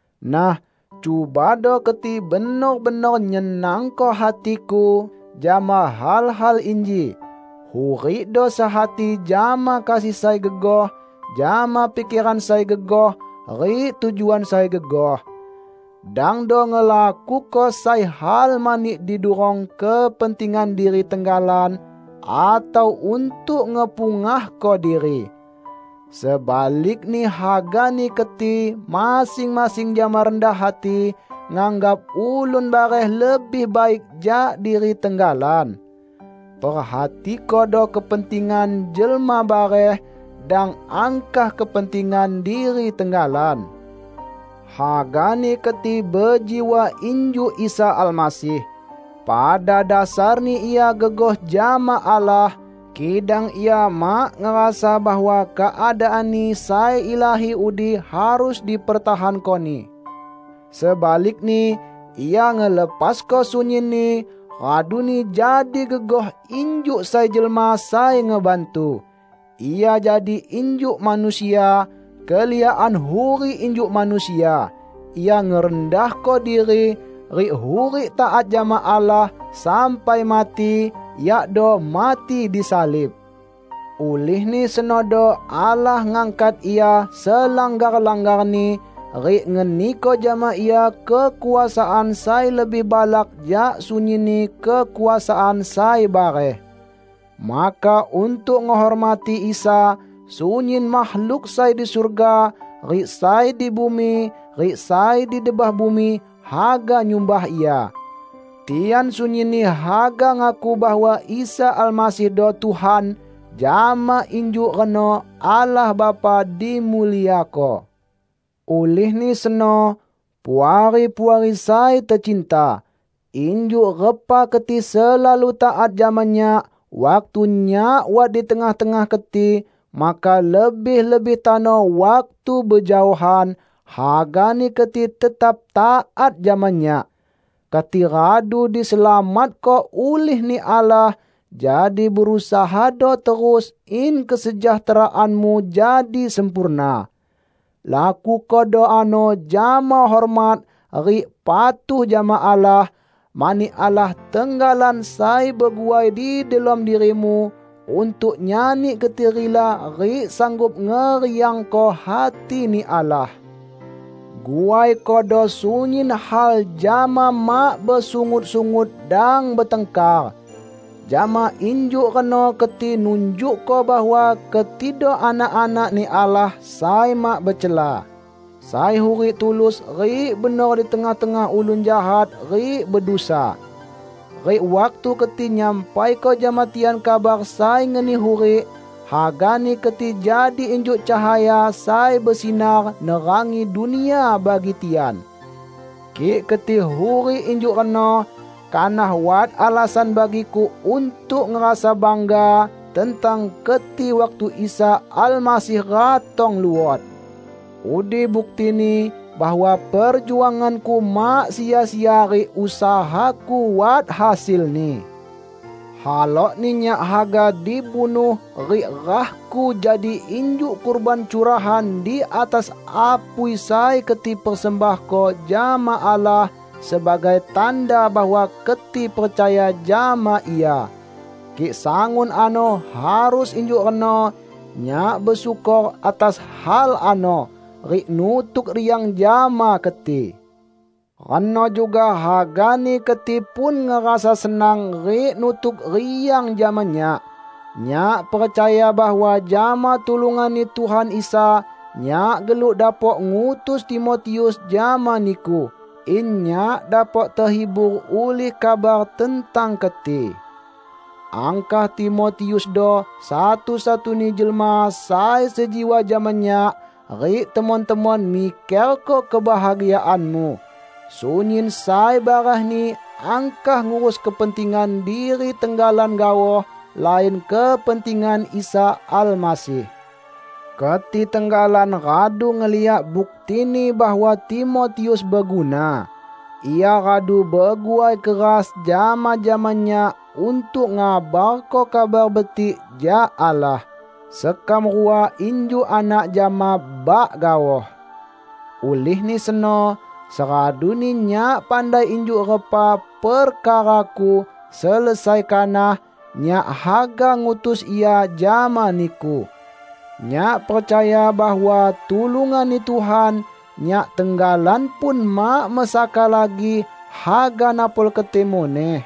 Nah, cubado keti benor-benor nyenangko hatiku jama hal-hal inji: Hurikdo sehati jama kasih sai gegoh, jama pikeran sai gegoh rik tujuan sai gegoh. Dangdo ngelakuko sai hal mani didurong kepentingan diri tenggalan, atau untuk ngepungahko diri. Sebalikni hagani keti masing-masing jama rendah hati nganggap ulun bareh lebih baik jak diri tenggalan. Perhatikodo kepentingan jelma bareh; dang angkah kepentingan diri tenggalan. Hagani keti bejiwa injuk Isa Almasih: Pada dasarni Ia gegoh jama Allah, kidang Ia mak ngerasa bahwa keadaan-Ni sai ilahi udi harus dipertahanko-Ni. Sebalikni, Ia ngelepasko sunyinni, raduni jadi gegoh injuk sai jelma sai ngebantu. Ia jadi injuk manusia, keliakan hurik injuk manusia. Ia ngerendahko diri, rik hurik taat jama Allah sampai mati -- yakdo mati disalib. Ulihni senodo Allah ngangkat Ia selanggar-langgarni, rik ngeniko jama Ia kekuasaan sai lebih balak jak sunyinni kekuasaan sai bareh. Maka untuk ngehormati Isa, sunyin makhluk sai di surga, rik sai di bumi rik sai di debah bumi, haga nyumbah Ia. Tian sunyinni haga ngaku bahwa Isa Almasihdo Tuhan; jama injuk reno Allah Bapa dimuliako. Ulihni seno, Puari-puari sai tecinta, injuk repa keti selalu taat jama nyak waktu nyak wat di tengah-tengah keti, maka lebih-lebih tano waktu bejaohan, hagani keti tetap taat jama nyak. Keti radu diselamatko ulih-Ni Allah, jadi berusahado terus in kesejahteraanmu jadi sempurna. Lakukodo ano jama hormat rik patuh jama Allah, mani Allah tenggalan sai beguai di delom dirimu untuk nyani keti rila rik sanggup ngeriangko hati-Ni Allah. Guaikodo sunyin hal jama mak besungut-sungut dang betangkar. Jama injuk reno keti nunjukko bahwa ketido anak-anak-Ni Allah sai mak becela, sai hurik tulus rik benor di tengah-tengah ulun jahat rik bedusa. Rik waktu keti nyampaiko jama tian kabar sai ngeni hurik, hagani keti jadi injuk cahaya sai besinar nerangi dunia bagi tian. Kik keti hurik injuk reno, kanah wat alasan bagiku untuk ngerasa bangga tentang keti waktu Isa Almasih ratong luot. Udi buktini bahwa perjuanganku mak sia-sia rik usahaku wat hasilni. Halokni nyak haga dibunuh rik rahku jadi injuk kurban curahan di atas apui sai keti persembahko jama Allah sebagai tanda bahwa keti percaya jama Ia. Kik sangun ano harus injuk reno, nyak besyukor atas hal ano rik nutuk riang jama keti. Reno juga hagani keti pun ngerasa senang rik nutuk riang jama nyak. Nyak percaya bahwa jama tulungan-Ni Tuhan Isa, nyak geluk dapok ngutus Timotius jama niku, in nyak dapok tehibur ulih kabar tentang keti. Angkah Timotiusdo satu-satuni jelma sai sejiwa jama nyak, rik temon-temon mikerko kebahagiaanmu. Sunyin sai barehni angkah ngurus kepentingan diri tenggalan gaoh, lain kepentingan Isa Almasih. Keti tenggalan radu ngeliak buktini bahwa Timotius beguna. Ia radu beguai keras jama-jama nyak untuk ngabarko Kabar Betik jak Allah. Sekam rua injuk anak jama bak gaoh. Ulihni seno, seraduni nyak pandai injuk repa perkaraku selesai kanah, nyak haga ngutus ia jama niku. Nyak percaya bahwa tulungan-Ni Tuhan, nyak tenggalan pun mak mesaka lagi haga napol keti muneh.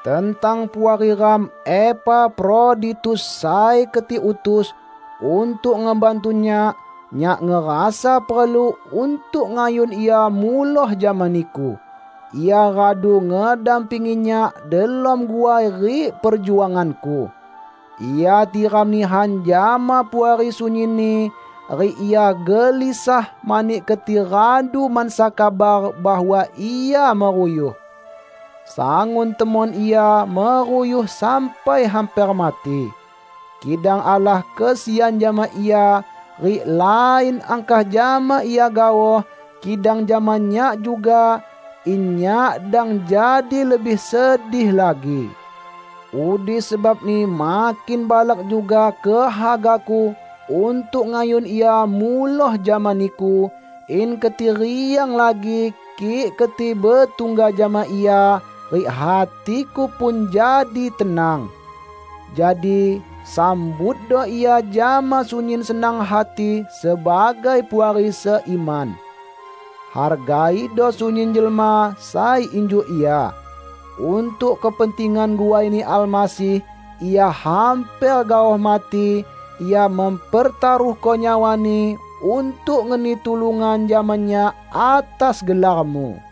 Tentang puari ram Epafroditus sai keti utus untuk ngebantu nyak, nyak ngerasa perlu untuk ngayun ia muloh jama niku. Ia radu ngedampingi nyak delom guai rik perjuanganku. Ia tiram nihan jama Puari sunyinni, rik ia gelisah mani keti radu mansa kabar bahwa ia meruyuh. Sangun temon ia meruyuh sampai hamper mati. Kidang Allah kesian jama ia; rik lain angkah jama ia gaoh, kidang jama nyak juga, in nyak dang jadi lebih sedih lagi. Udi sebabni makin balak juga kehagaku untuk ngayun ia muloh jama niku, in keti riang lagi kik keti betungga jama ia, rik hatiku pun jadi tenang. Jadi, sambutdo ia jama sunyin senang hati sebagai puari seiman. Hargaido sunyin jelma sai injuk ia. Untuk kepentingan guai-Ni Almasih, ia hamper gaoh mati; ia mempertaruhko nyawani untuk ngeni tulungan jama nyak atas gelarmu.